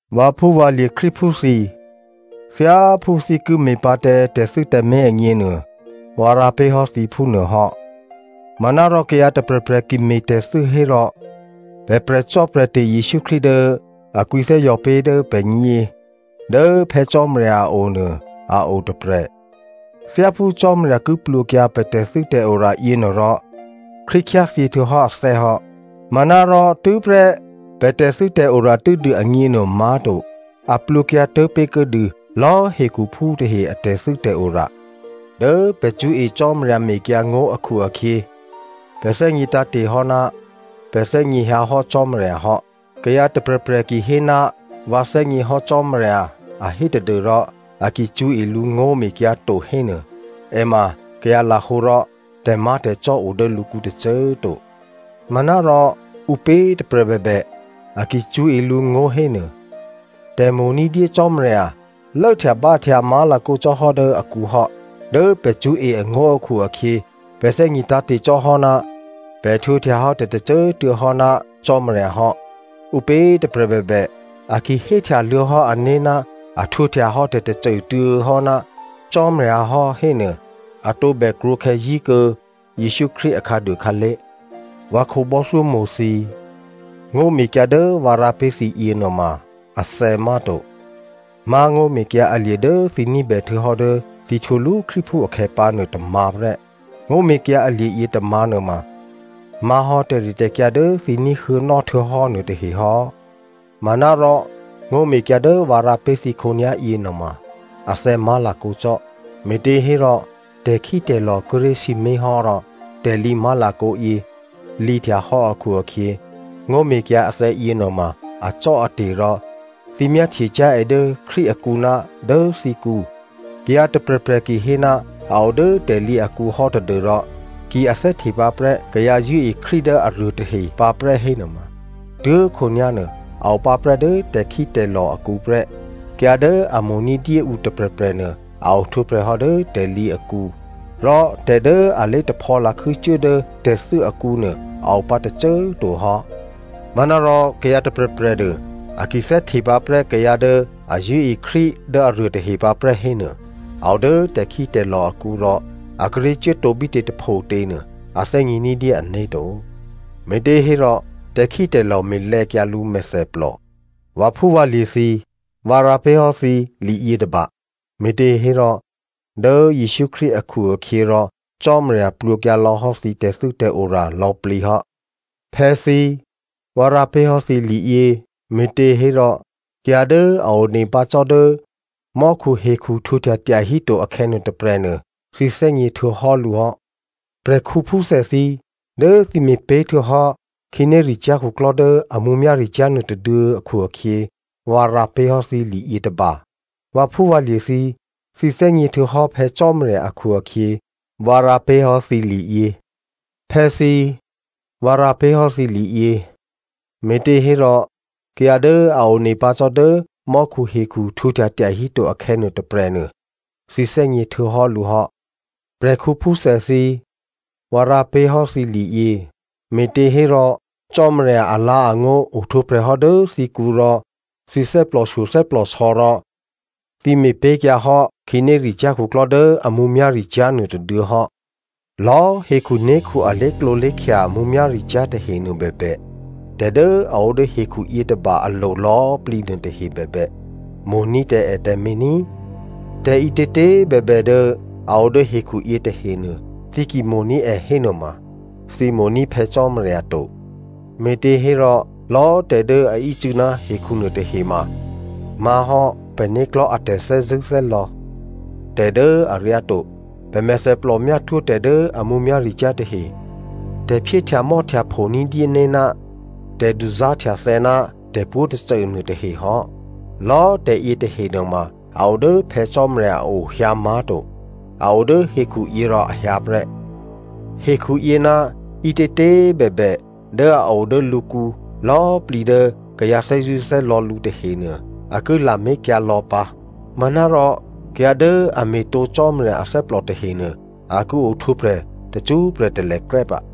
Vǎphúvǎlye̤ Krístuphú thǐ꤮, thyáphú thǐ ki me̤pǎ tǎ tè̤thû́ tǎmé̤ agněnuô, vǎ rǎ pé̤hò́ thǐ phúnuô hò́. Manárò kayǎ tôprè̤prè̤ ki me̤tè̤thû́ hérò, pè̤ prè̤cò́prè̤te̤ Jesǔ Krístu dố a kwǐthè́zò̤ pé̤ dố pè̤gně dố Phè̌ Cò́marya a o nuô a o tôprè̤. Thyáphú Cò́marya ki plwǒkyǎ pè̤ tè̤thû́tè̤ora yěnuôrò Krístu khyáthyěhtuô̌hò́ athè́ hò́. Manárò tû́prè́ pè̤ tè̤thû́tè̤ora tû́dû agněnuô má̤to, a plwǒkyǎ tố̤pé̤kuô̌dû lò̌꤮ hekhuphú tahe a tè̤thû́tè̤ora. Dố pè̤ cṳ̌e Cò́marya mekyǎngó̤ akhu-akhyě, pè̤ thè́gně tǎ̤te̤ hò́ ná pè̤ thè́gněhyǎ hò́ Cò́marya hò́. Kayǎ tôprè̤prè̤ kihéná vǎ thè́gněhò́ Cò́marya a hé tadû́rò a ki cṳ̌e lǔ ngó̤mekyǎ to hénuô, è ma kayǎ lahǒ rò tè̤má̤tè̤cò́ o dố lǔkǔ tôcô꤮ to. Manárò ǔpě tôprè̤ bèbè, a ki cṳ̌e lǔngó̤ hénuô, tè̤mo̤ ní̤dyé Cò́marya lốhtyabǎhtya má̤lakǒ cò́hò́ dố akǔ hò́. Dố pè̤ cṳ̌e angó̤ akhu-akhyě, pè̤ thè́gně tǎ̤te̤ cò́hò́ ná pè̤ htwǒhtyahò́ tè̤tôcô꤮ tuô̌ hò́ ná Cò́marya hò́. Ǔpě tôprè̤ bèbè a ki héhtyaluô̌ hò́ ané̤ ná a htwǒhtyahò́ tè̤tôcô꤮ tuô̌ hò́ ná Cò́marya hò́ hénuô, a tǒbè krwǒkhè̌ zí̤kuô̌ Jesǔ Krístu akhǎduô khǎlé̤. Vǎ khǒbò́thyómo̤ thǐ꤮, ngó̤mekyǎ dố vǎ rǎ pé̤ thǐ yěnuôma athè̌ má̤to, má̤ ngó̤mekyǎ alye̤ dố thǐ ní̤bè htuô̌hò́ dố thǐ htwǒlú Krístuphú akhè̌ pǎnuô tômǎ̤ prè́. Ngó̤mekyǎ alye̤ yětômǎ̤ nuôma má̤hò́ tè̤ritè̤kyǎ dố thǐ ní̤huô̌nò́ htuô̌hò́ nuôtahe hò́. Manárò ngó̤mekyǎ dố vǎ rǎ pé̤ thǐ khǒnyá̤yě nuôma athè̌ má̤lakǒ cò́, me̤těhérò tè̤khítè̤lò̤ kíré̤ sǐmé̤ hò́ rò tè̤lǐ má̤lakǒ yě lǐhtyahò́ akhu-akhyě, ngó̤mekyǎ athè̌yě nuôma acò́ate̤ rò thǐ myáhtyecyá̤ è dố Krístu akǔ ná dố thǐkǔ. Kayǎ tôprè̤prè̤ kihéná a o dố tè̤lǐ akǔhò́ tadû́rò ki a thè́htepǎprè́ kayǎ zṳ̂́e Krístu dố aruôtahe pǎprè́ hénuôma tuố̤khǒnyá̤ nuô a opǎprè́ dố tè̤khítè̤lò̤ akǔ prè́. Kayǎ dố a mo̤ ní̤dyé ǔ tôprè̤prè̤nuô, a ohtwǒprè̤hò́ dố tè̤lǐ akǔ, rò tè̤ dố a lé̤taphò̌ lakhû́ cuố dố tè̤thû́ akǔnuô a opǎ tôcô꤮ to hò́. Manárò kayǎ tôprè̤prè̤nuô, a ki thè́hte pǎ prè́ kayǎ dố a zṳ̂́e Krístu dố aruôtahe pǎprè́ hénuô a o dố tè̤khítè̤lò̤ akǔ rò a kíré̤ cuốtǒ bítě tôphotě nuô a thè́gně ní̤dyé ané̤ to, me̤těhérò tè̤khítè̤lò̤ me̤lè̌kyǎ lǔ mèthèplò. Vǎphúvǎlye̤ thǐ꤮, vǎ rǎ pé̤hò́ thǐ liyětôba, me̤těhérò dố Jesǔ Krístu akhu-akhyěrò Cò́marya plwǒkyǎ lò̌ hò́ thǐ tè̤thû́tè̤ora lò̌꤮ plǐ hò́. Phè̌thǐ꤮, vǎ rǎ pé̤ hò́ thǐ liyě, me̤těhérò kayǎ dố a one pǎ cò́ dố mò́khuhekhu htwǒhtya tyahíto akhè̌nuô tôprè̤nuô, thǐ thè́gně htuô̌hò́ lǔ hò́. Prè̤khǔphúthè thǐ꤮, dố thǐ me̤pé̤htuô̌hò́ khǐnéricyá̤ khuklò́ dố a mǔmyá̤ricyá̤ nuôtôduô̌ akhu-akhyě, vǎ rǎ pé̤hò́ thǐ liyětôba. Vǎphúvǎlye̤ thǐ꤮, thǐ thè́gně htuô̌hò́ Phè̌ Cò́marya akhu-akhyě, vǎ rǎ pé̤hò́ thǐ liyě. Phè̌thǐ꤮, vǎ rǎ pé̤hò́ thǐ liyě, me̤těhérò kayǎ dố a one pǎ cò́ dố mò́khuhekhu htwǒhtya tyahíto akhè̌nuô tôprè̤ nuô, thǐ thè́gně htuô̌hò́ lǔ hò́. Prè̤khǔphúthè thǐ꤮, vǎ rǎ pé̤hò́ thǐ liyě, me̤těhérò Cò́marya alǎ̤angó̤ ohtwǒprè̤ hò́ dố thǐkǔ rò thǐ thè́plòshyo thè́plòsò̌ rò thǐ me̤pé̤kyǎ hò́ khǐnéricyá̤ khuklò́ dố a mǔmyá̤ricyá̤ nuôtôduô̌ hò́. Lò̌꤮ hekhuné̤khu a lé̤klǒlé̤khya mǔmyá̤ricyá̤ tahenuô bèbè, tè̤ dố a o dố hekhu yětôba alo̤ lò̌꤮ plǐ nuôtahe bèbè, mo̤ní̤ tǎ è tǎmé̤ ní꤮. Tè̤ ǐtětě꤮ bèbè dố a o dố hekhuyě tahenuô, thǐ ki mo̤ní̤ è hénuôma, thǐ mo̤ní̤ Phè̌ Cò́marya to. Me̤těhérò, lò̌꤮ tè̤ dố a ícû̌ ná hekhu nuôtahe ma má̤hò́ pè̤né̤klò̤́ a tè̤thè́zṳ̂́thè́lò̌ tè̤ dố aryáto, pè̤ mèthèplò myátwó̤ tè̤ dố a mǔmyá̤ricyá̤ tahe, tè̤phyéhtyamò́htyapho ní̤dyéné̤ ná tè̤duzá̤htyathè̌ ná tè̤pwǒ̤꤮ tôcô nuôtahe hò́. Lò̌꤮ tè̤ yětahe nuôma a odố Phè̌ Cò́marya a o hyǎ má̤to, a o dố hekhuyě rò a hyǎ prè́. Hekhuyě ná ǐtětě꤮ bèbè dố a o dố lǔkǔ lò̌꤮ plǐ dố kayǎ thè́zṳ̂́thè́lò̌ lǔ tahenuô, a ki lamé̤kyǎ lò̌ pǎ, manárò kayǎ dố a me̤tǒ Cò́marya athè́plò tahenuô a ki ohtwǒprè̤ tacṳ́prè̤ talèkrè́ pǎ.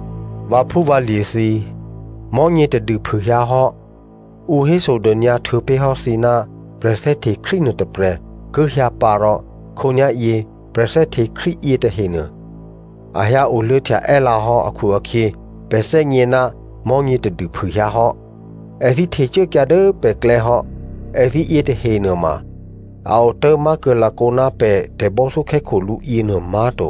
Vǎphúvǎlye̤ thǐ꤮, mò̤́nyě tadû phûhyǎhò́, ǔ hésodônyǎ htuô̌pé̤hò́ thǐ ná prè̤thè́hte Krístu nuôtôprè̤ ki hyǎ pǎ rò khǒnyá̤yě prè̤thè́hte Krístu yětahenuô a hyǎoluô̌htya è́lǎ hò́ akhu-akhyě pè̤ thè́gně ná mò̤́nyě tadû phûhyǎhò́. Èthǐ htecuốkyǎ dố pè̤klè̌ hò́. Èthǐ yětahe nuôma a otố̤ má̤kuô̌ lakǒ ná pè̤ tè̤bò́thyókhè́khǒ lǔ yěnuô má̤to.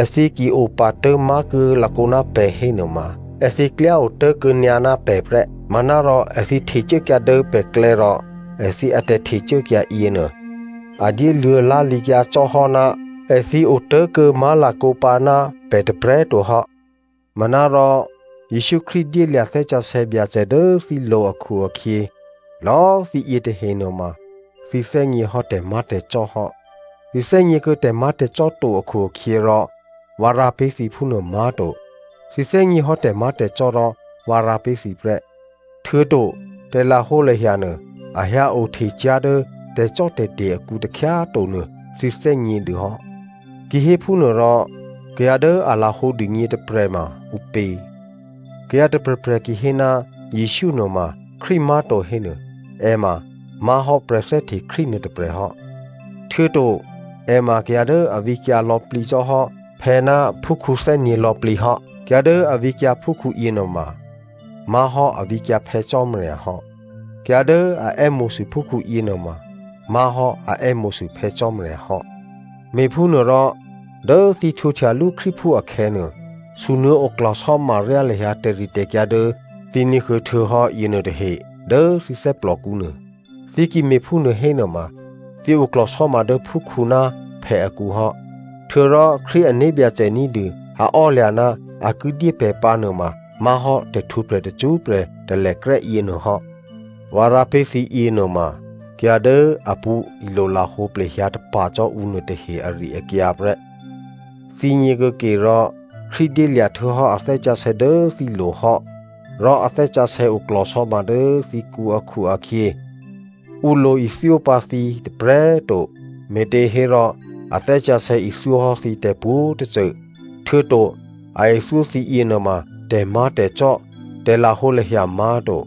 Èthǐ ki opatố̤ má̤kuô̌ lakǒ ná pè̤ hénuôma èthǐ klyá otố̤kuô̌ nyǎ ná pè̤ prè́. Manárò èthǐ htecuốkyǎ dố pè̤klè̌ rò èthǐ atè̤htecuốkyǎ yěnuô a dyéluô̌ lá̤lǐkyǎ cò́ hò́ ná èthǐ otố̤kuô̌ má̤lakǒ pǎ ná pè̤ tôprè̤꤮ to hò́. Manárò Jesǔ Krístu dyélya̤ Thè́ Sǎsè̌ Byacè dố thǐlo̤ akhu-akhyě, lò̌꤮ thǐ yětahe nuôma thǐ thè́gněhò́ tè̤má̤tè̤cò́ hò́. Thǐ thè́gněkuô̌ tè̤má̤tè̤cò́ to akhu-akhyěrò vǎ rǎ pé̤ thǐ phúnuô má̤to. Thǐ thè́gněhò́ tè̤má̤tè̤cò́ rò vǎ rǎ pé̤ thǐ prè́. Htuô̌to tè̤lahǒlahya nuô a hyǎ o htecyá̤ dố tè̤cò́tè̤te̤ akǔ takhyá꤮ to nuô thǐ thè́gnědû hò́. Kihéphúnuôrò kayǎ dố a lahǒ dûgně tôprè̤ ma ǔpě? Kayǎ tôprè̤prè̤ ki hé ná Jesǔ nuôma Krístu má̤to hénuô, è ma má̤hò́ prè̤thè́hte Krístu nuôtôprè̤ hò́, htuô̌to è ma kayǎ dố a vǐkyǎ lò̌plǐ cò́ hò́ phè̌ ná phúkhǔ thè́gně lò̌plǐ hò́. Kayǎ dố a vǐkyǎ phúkhǔ yěnuôma má̤hò́ a vǐkyǎ Phè̌ Cò́marya hò́. Kayǎ dố a è́mo̤sû phúkhǔ yěnuôma má̤hò́ a è́mo̤sû Phè̌ Cò́marya hò́. Me̤phúnuôrò, dố thǐ htwǒhtyalú Krístuphú akhè̌nuô, sunuô̌ oklò̤sò́ma ryá lahyǎ tè̤ritè̤kyǎ dố thǐ ní̤huô̌ htuô̌hò́ yěnuô tahe dố thǐ thè́plòkǔ nuô. Thǐ ki me̤phúnuô hénuôma thǐ oklò̤sò́ma dố phúkhǔ ná phè̌ akǔ hò́. Htuô̌rò Krístu ané̤byacè ní̤dû a ò́lya̤ ná a ki dyé pè̤ pǎ nuôma má̤hò́ tè̤htwǒprè̤ tacṳ́prè̤ talèkrè́ yěnuôhò́. Vǎ rǎ pé̤ thǐ yěnuôma, kayǎ dố a pṳ̌ ilolahǒ plehyǎ tapa̤ cò́ ǔ nuôtahe ari-akyǎ prè́. Thǐgně kuô̌ke rò, Krístu dyélya̤ htuô̌hò́ a Thè́ Sǎsè̌ dố thǐlo̤ hò́, rò a Thè́ Sǎsè̌ oklò̤sò́ma dố thǐkǔ akhu-akhyě, ǔ lo ithyó pǎ thǐ tôprè̤꤮ to, me̤těhérò a Thè́ Sǎsè̌ ithyó hò́ thǐ tè̤pwǒ̤꤮ tôcô, htuô̌to a ithyó thǐ yěnuôma tè̤má̤tè̤cò́, tè̤lahǒlahya má̤to.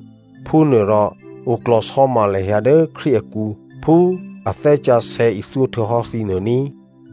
Phúnuôrò oklò̤sò́ma lahyǎ dố Krístu akǔ phú a Thè́ Sǎsè̌ ithyó htuô̌hò́ thǐ nuô ní꤮.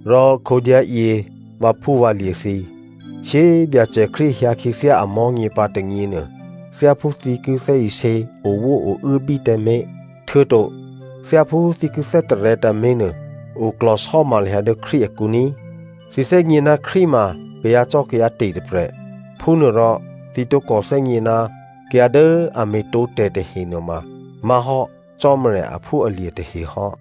Rò khǒnyá̤yě vǎphúvǎlye̤ thǐ꤮, shyé꤮ Byacè Krístu hyǎ khyěthyá amò̤́nyě pǎ tônyěnuô, thyáphú thǐ ki thè́isě owó ouốbí tǎmé̤, htuô̌to thyáphú thǐ ki thè́tarè̤̌ tǎmé̤ nuô, oklò̤sò́ma lahyǎ dố Krístu akǔ ní꤮. Thǐ thè́gně ná Krístu ma kayǎcò́kayǎte̤ tôprè̤. Phúnuôrò thǐ tǒkò thè́gně ná kayǎ dố a me̤tǒtè̤ tahe nuôma má̤hò́ Cò́marya aphúalye̤ tahe hò́.